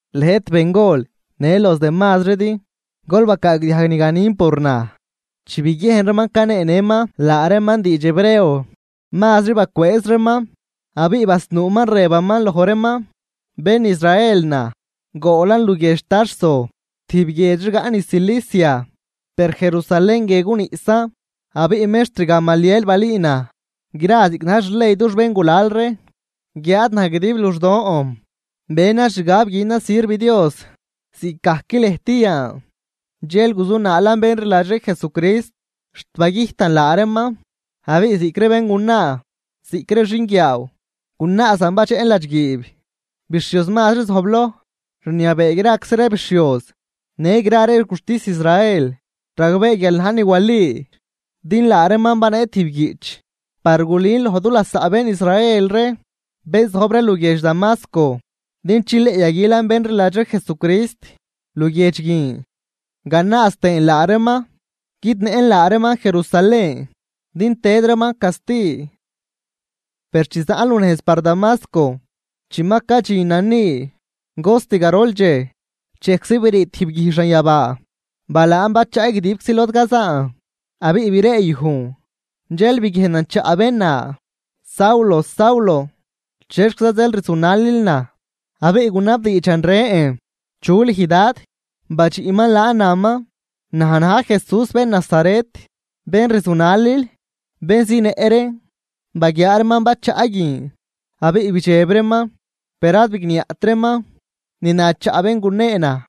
―Lëjt bengol në los demazridi, gol bacaagdiajg ni ganin por naj. Chi biguiejn reeman caneenëman laa reeman diidx hebreo, mazri bacwëëz reeman. Abiꞌ basnuuman rëbaman loj reeman: ―Bén Israel naj. Goolan luguiedx Tarso tijb guiedx rigaꞌ niz Cilicia, per Jerusalén guie guniꞌsan. Abiꞌ mextr Gamaliel balüü naj gra ziꞌc na̱j xley dux bén gulal ree. Guiáad naj guidib luxdon benan xgab güünan sirv Dios ziꞌcgajc lëjt yan. Dxel guzunaalan bén rliladx ree Jesucrist, xt bagüjtan laa reeman abiꞌ ziꞌc ree béngunaa ziꞌc ree xinguiaaw gunaazan badxeꞌn ladxguiib. Bixhioz mazri zojbloj rniabee graczi ree bixhioz në gra ree guxtis Israel ragbee guial najn ni wali. Din laa reeman banee tijb guiꞌch par gulün loj du lasaꞌ bén Israel ree, bén zojb ree luguiedx Damasco din chileꞌ yaguilan bén rliladx ree Jesucrist luguiedx guin, ganaaz tëën laa reeman guidnëꞌn laa reeman Jerusalén din tëd reeman casti. ’Per chi zaꞌn lunejz par Damasco, chi ma cadxinan ni cost garol dxej, dxejczi brii tijb guij xanyabaa balaan bachaꞌ guidibczi lod cazaan, abiꞌ breeyujn. Dxel biguiejnan chaꞌ bén na: “Saulo, Saulo, ¿chexquiza zeel rzunalil naj?” Abiꞌ gunabdiidxan rën: “¿Chu lüj Dad?” badxiꞌman laan naman: “Naj na̱j Jesús, bén Nazaret, bén rzunalil.” Bén zinëꞌ reen baguiaa reeman bachaꞌ guin abiꞌ bidxeb reeman, per ad bigniaꞌt reeman ni na chaꞌ bén gunee naj.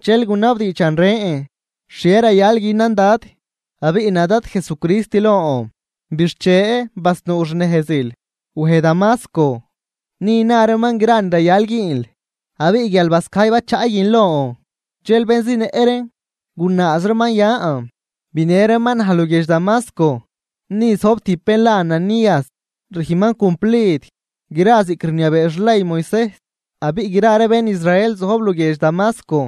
Dxel gunabdiidxan rën: “¿Xhie rayal günan Dad?” Abiꞌ na Dad Jesucrist lon: “Bixche, basnuu xnejzil wej Damasco. Ni na reeman gra ni rayal güünl.” Abiꞌ guial bascajy bachaꞌ guin lon, dxel bén zinëꞌ reen gunaaz reeman yan, binë reeman naj luguiedx Damasco. ’Ni zojb tijb bén la Ananías, rüjnman cumplid gra ziꞌc rniabee xley Moisejs. Abiꞌ gra ree bén Israel zojb luguiedx Damasco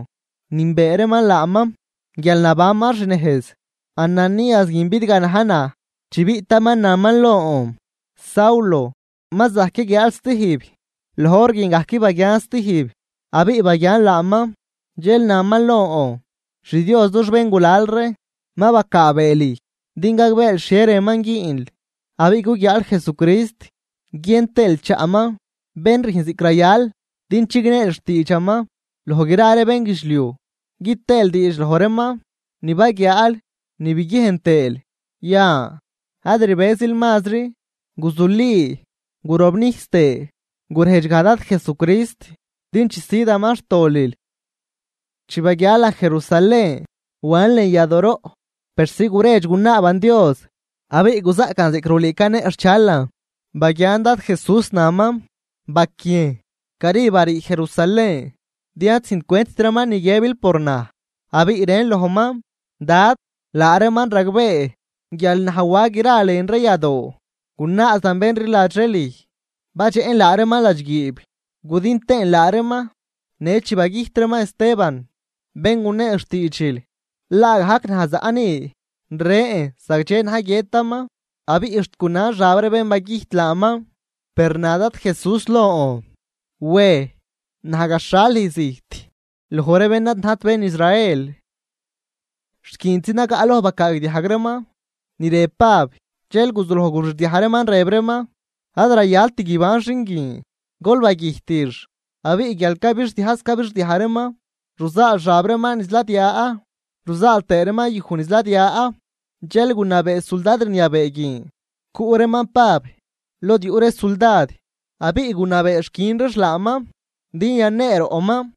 nünbee laaman guial nabanman xnejz. Ananías guin bidganaj naj, chi biꞌtaman naman lon: “Saulo, ma zajc yaguiaal stijb.” Loj hor guin gajc baguian stijb abiꞌ baguian laaman. Dxel naman lon: “XDios dux béngulal ree ma bacaabee lüj din gagbeel xhie rënman güünl, abiꞌ guguiaal Jesucrist guien tëël chaꞌman, bén rüjn ziꞌc rayal. Din chigneel xtiidxaman loj gra ree bénguidxliuj, gü tëël diidx loj reeman ni baguiaal ni biguiejn tëël. Yan, ad rbëzil mazri, guzuli gurobnijs tëë gurejdx gaj Dad Jesucrist din chisüdaman xtolil.” ’Chi baguialan Jerusalén, wan lën yadooroꞌ persi guredx gunaaban Dios, abiꞌ guzaꞌcan ziꞌc rulüü caneꞌxhchalan. Baguian Dad Jesús naman: “Baquiejn. Cari barii Jerusalén, din ad züjncwentt reeman ni guiëbil por naj.” Abiꞌ rën lojman: “Dad, laa reeman ragbee guial naj wa gra lën ree yadoo gunaazan bén rliladx ree lüj, badxeꞌn laa reeman ladxguiib gudin tëën laa reeman. Në chi bagüjt reeman Esteban, bén gunee xtiidxil, laagajc naj zaꞌ ni rën zagdxe na̱j guiëtaman abiꞌ xt gunan xab ree bén bagüjt laaman.” Per na Dad Jesús lon: “Wej, naj gaxhal lüj zijt loj ree bén ad najt bén Israel.” Xt guintzi nagaꞌloj bacaagdiajg reeman ni rëb Pab dxel guzuloj gurixdiaj reeman rëb reeman: ―¡Ad rayalt guiban xin guin! ¡Gol bagüjtix! Abiꞌ guial cabixdiajz cabixdiaj reeman, ruzaal xab reeman niz ladia ruzaal tëë reeman yuj niz ladia. Dxel gunabee suldad rniabee guin cuꞌ reeman Pab lod yuꞌ ree suldad abiꞌ gunabeex quiꞌn reex laaman din yaneeroꞌman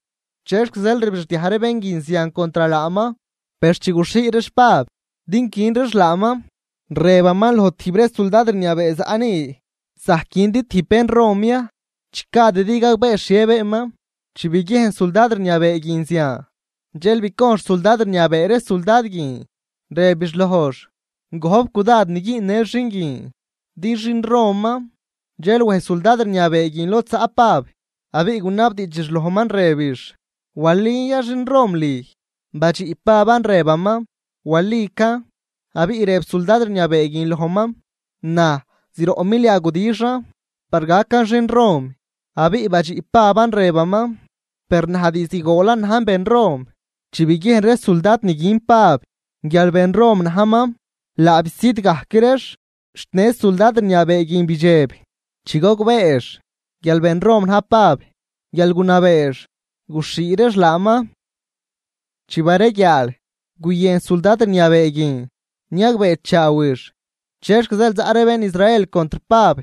chexc zeel rbixdiaj ree bén guin zian contr laaman. Per chi guxhii reex Pab din quin reex laaman, rëbaman loj tijb ree suldad rniabee zaꞌ ni: ―¿Zajc quindi tijb bén Rom ya, chi gadidi gagbee xhie beenman? Chi biguiejn suldad rniabee guin zian, dxel bicojnx suldad rniabee ree suldad guin, rëbix lojx: ―Gojp cudad ni güünnël xin guin, din xin Roman. Dxel wej suldad rniabee guin lod zaꞌ Pab, abiꞌ gunabdiidxix lojman rëbix: ―¿Walin ya xin Rom lüj? Badxiꞌ Paban rëbaman: ―Walican. Abiꞌ rëb suldad rniabee guin lojman: ―Naj zroꞌ milia gudixan par gacan xin Rom. Abiꞌ badxiꞌ Paban rëbaman: ―Per naj diizd goolan najn bén Rom. Chi biguiejn ree suldad niguin Pab, guial bén Rom najman, laa bisüd gajc reex. Xt në suldad rniabee guin bidxeb chi gogbeex guial ben Rom na̱j Pab guial gunabeex guxhii reex laaman. Chi bareguiaal, guyën suldad rniabee guin niagbeechaawix chexc zeel zaꞌ ree bén Israel contr Pab.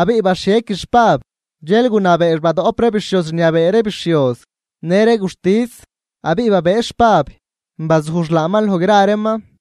Abiꞌ baxhiequix Pab, dxel gunabeex badoꞌp ree bixhioz rniabee ree bixhioz në ree guxtis. Abiꞌ babëëx Pab bazujx laaman loj gra reeman.